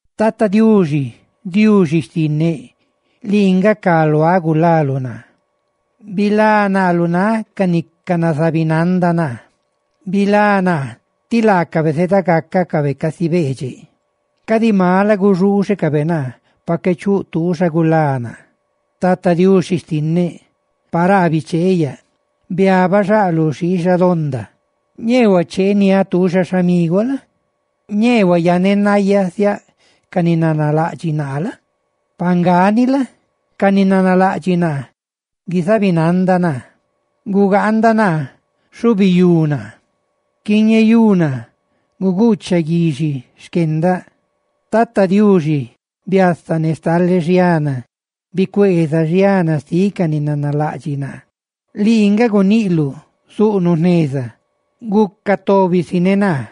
Tata Diuxi, Diuxi xtinneꞌ lii nga cá luaꞌ gulaluꞌ naa; ¡bilá naa lu náꞌ ca ni canazabinanda naa! ¡Bilá naa tí laacabe zeda gácacabe casi beedxeꞌ; cadi mala guxuuxecabe naa pa qué chuꞌ tuuxa gulá naa! Tata Diuxi xtinneꞌ, paraa bicheeꞌ yaꞌ, biabaꞌ xaꞌ lu xiixa donda. Ñee huacheeniáꞌ tuuxa xhamiguaꞌ la? Ñee huayanenayasiáꞌ ca ni nanalaꞌdxiꞌ naa la? Ne pa nga ni la? ca ni nanalaꞌdxiꞌ naa guizabinanda naa; gugaanda naa, xhubiyú naa, quiñeyú naa, guguuchaꞌ guixi xquendaꞌ. ¡Tata Diuxi, biasa ne xtale xiana! ¡Bicueeza xiana xtiꞌ ca ni nanalaꞌdxiꞌ naa! Lii nga guniꞌluꞌ, zuꞌnuꞌ jneza, ¡guca tóbisi ne naa!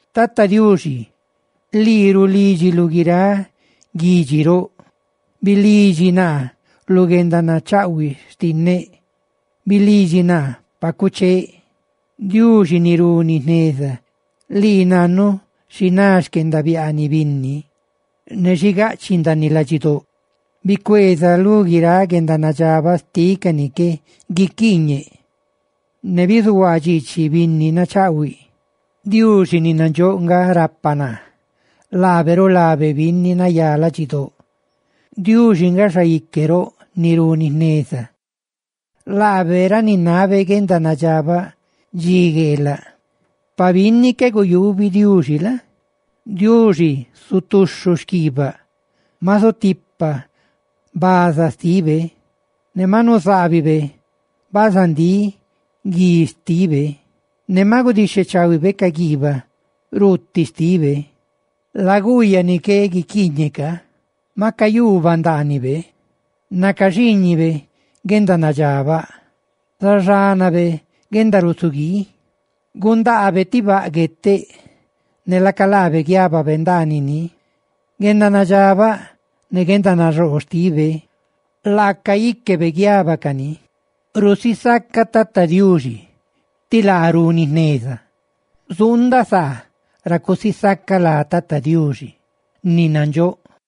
Tata Diuxi lii rulídxiluꞌ guiráꞌ guidxi roꞌ. Bilidxi naa lu guendanachaꞌhuiꞌ xtinneꞌ; bilidxi naa pa cuchee. Diuxi ni runi jneza, lii nannu xi ná xquendabiaaniꞌ binni ne xi gaꞌchiꞌ ndaaniꞌ ladxidóꞌ, ¡bicueeza lu guiráꞌ guendanadxabaꞌ xtiꞌ ca ni qué guiquiiñeꞌ, ne bizuhuaa dxiichiꞌ binni nachaꞌhuiꞌ! Diuxi ni nandxóꞌ nga rapa naa, laabe rulabe binni nayá ladxidóꞌ. Diuxi nga xaique roꞌ ni runi jneza; laabe raninabe guendanadxabaꞌ dxi gueelaꞌ. Pa binni qué guyubi Diuxi la? Diuxi zutuxhu xquiibaꞌ; maꞌ zutipa bazaa xtibe, ne ma nuzaabibe bazandíꞌb guí xtibe, ¡ne maꞌ gudixhechaahuibe ca guiibaꞌ ruuti xtibe! Laguuyaꞌ ni qué guiquiiñeꞌ ca maꞌ cayuubaꞌ ndaaniꞌ nacaxiiñiꞌ guendanadxabaꞌ, zaxanaꞌ guendarusiguii. Gundaabe ti baꞌ gueteꞌ, ne laca laabe guiababe ndaaniꞌ ni. ¡Guendanadxabaꞌ ne guendanaxoo xtibe laaca íquebe guiabacani! Zusisacaꞌ Tata Diuxi tí laa runi jneza; zuundaꞌ saa ra cusisacaꞌ lá Tata Diuxi ni nandxóꞌ.